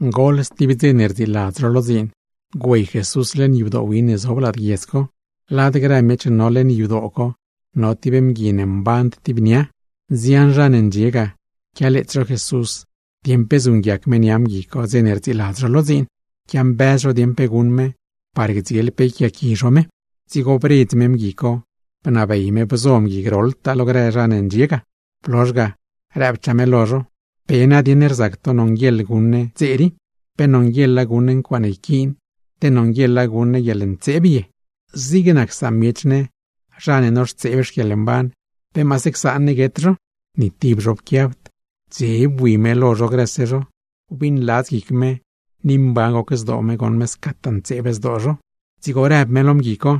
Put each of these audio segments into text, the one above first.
Goḻ stib dze ne rdziiladz zho lo dziin, güey Jesús leṉ yadoo win ne zob lad guiedz co. Lad grë miech ne no leṉ yadoo co, no tib mgui ne mband tib nia. Nzian zha ne ndxie ga, quialeets zho Jesús dieṉ pe zuṉguiac me nia mgui co dze ne rdziiladz zho lo dziin. Quiambëz zho dieṉ pe guṉ me, par gdziel pe yquiaaqui zho me. Dzigo bredz me mgui co, bnabey me bzo mgui groḻtaa lo grë zha ne ndxie ga; blozh ga rëbchaa me lo zho: ―¿Pe nadieṉ rzac to nonguieḻ guṉ ne dze rii? ¿Pe nonguieḻa guṉ ne ncuaaṉe yquiin, te nonguieḻa guṉ ne guieḻntseeb ye? Zig nac samiech ne zha ne noxtseeb xquieḻmban, ¿pe maase csaan ne guet zho? Ni tib zho pquiabd. Dze bui me lo zho grëse zho, wbiṉladz guic me, ni mban goc zdoo me goṉ me scataa ntseeb zdoo zho; dzigo rëb me lo mgui co: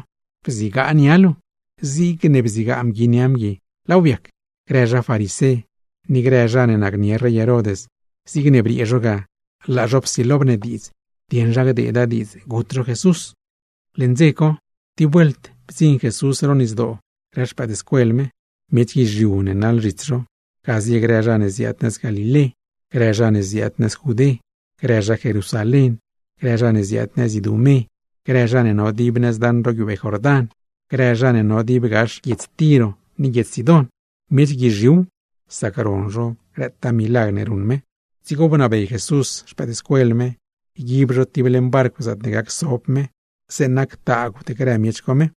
―Bzigaa nia luu. Zigne bzigaa mgui nia mgui, laaw biac. Grë zha farisé, ni grë zha ne nacnie rey Herod, zigne briee zho ga laa zho psilo bnediidz dieṉ zha gdeeda diidz gut zho Jesús. Leṉ dze co, tib vuelt bdziṉ Jesús ro nisdoo grë xpëëdscuel me. Miech guizhiu ne naḻ zhits zho, ga zie grë zha ne ziaad nëz Galilé, grë zha ne ziaad nëz Judé, grë zha Jerusalén, grë zha ne ziaad nëz Idumé, grë zha no dib nëz daṉ ro guiubee Jordán, grë zha ne no dib gax guiedz Tiro ni guiedz Sidón. Miech guizhiuw, sac ron zho grëtaa milagr ne ruṉ me. Dzigo bnabey Jesús xpëëdscuel me, yguib zho tib leṉ barcw zaatne gac so me zeeṉa ctaagwd grë miech co me.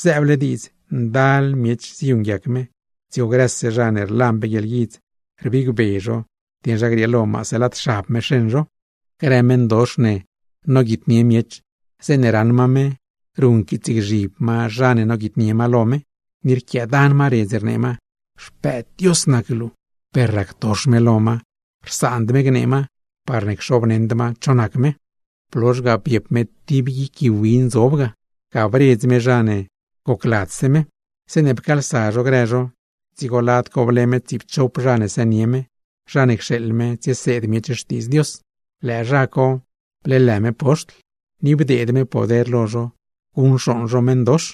Zëëble diidz ndal miech ziyuṉguiac me, dzigo grëse zha ne rlan pe guieḻguidz, rbigbe zho dieṉ zha grieelo maase lad xab me xeṉ zho. Grë meṉdox ne noguitnie miech, zeeṉe raṉ ma me, ruṉquiitsgzhib ma zha ne noguitnie ma lo me ni rquiaadan ma redz rnee ma: ―¡Xpëëd Dios nac luu! Per ractox me lo ma, rsaand me gnee ma parne xoobneṉd cho nac me. Blozh ga biep me tib guic gui win zob ga, ga bredz me zha ne gocladzse me. Zeeṉe pcaalsa zho grë zho, dzigo lad co ble me tsiipchop zha ne sënie me, zha ne cxeeḻ me tsieseed miech Xtiidz Dios. Lëë zha co bleelë me poxtl, ni bdeed me poder lo zho guṉcxooṉ zho meṉdox.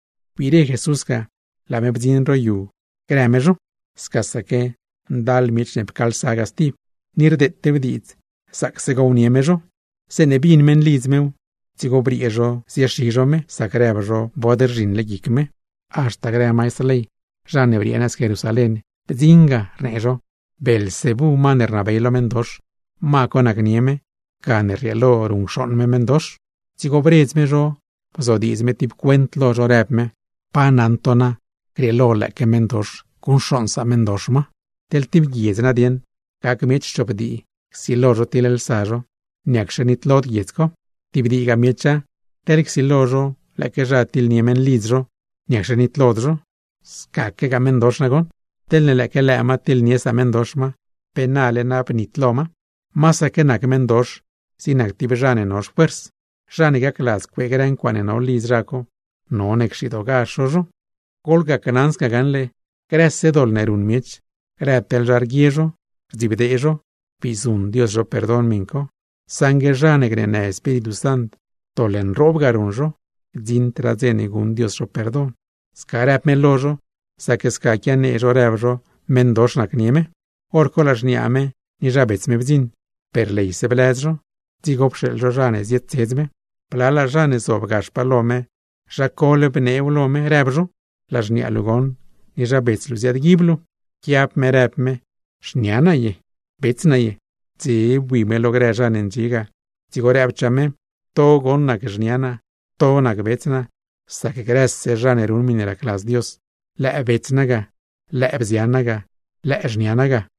Wbire Jesús ga, laa me bdziṉ ro yu grë me zho. Scasaque ndal miech ne pcaalsa ga stib, ni rdeetew diidz gownie me zho. Zeeṉe bin meṉlidz mew, dzigo briee zho ziexi zho me, sac rëb zho bod rzhiṉle guic me. Haxta grë maistr ley, zha ne briee nëz Jerusalén bdziṉ ga, rnee zho: ―Beelzebú, ma ne rnabey lo meṉdox, ma co nacnie me gane rrieelo ruṉcxooṉ me meṉdox. Dzigo bredz me zho bzodiidz me tib cuent lo zho, rëb me: ―¿Pa naṉ to na grieelo lëëque meṉdox guṉcxooṉ sameṉdox ma? Teḻ tib guiedz nadieṉ gac miech chop dii, csilo zho tiḻlsa zho, ¿niacxe nitlod guiedz co? Tib diigaa miecha, teḻ csilo zho lëëque zha tiḻnie meṉlidz zho, ¿niacxe nitlod zho? Scaquegaa meṉdox nagoṉ, teḻne lëëque lëë ma tiḻnie sameṉdox ma, ¡pe nale na bnitlo ma! Masaque nac meṉdox zig tib zha ne no xfuers, zha ne gacladz cuee grë ncuaaṉe no lidz zha co, none cxidoogazh zho zho. ’Gneli naa lo to gaṉle, grëse doḻ ne ruṉ miech, grë teḻ zha rguie zho, rdzibdee zho, bii zuṉ Dios zho perdon miṉ co; saṉgue zha ne gneenë Espíritu Sant, doḻ nroob ga ruṉ zho, gdziṉd dze ne guṉ Dios zho perdon. Sca rëb me lo zho, sac sca quianee zho rëb zho meṉdox nacnie me. Horco laa xniaa me ni zha bets me bdziṉ, per leyse blëz zho; dzigo pxeeḻ zho zha ne zietsedz me. Blalaa zha ne zob gaxpaa lo me, zha co beeṉ vis rëb zho: ―Laa xniaa luu goṉ, ni zha bets luu ziaadguib luu. Pquiab me rëb me: ―¿Xnia naa ye, bets naa ye? Dze bui me lo grë zha ne ndxie ga, dzigo rëbchaa me: ―To goṉ nac xnia naa, to nac bets naa. Sac grëse zha ne ruṉ miṉe racladz Dios, lëë bets naa ga, lëë bzian naa ga, lëë xnia naa ga.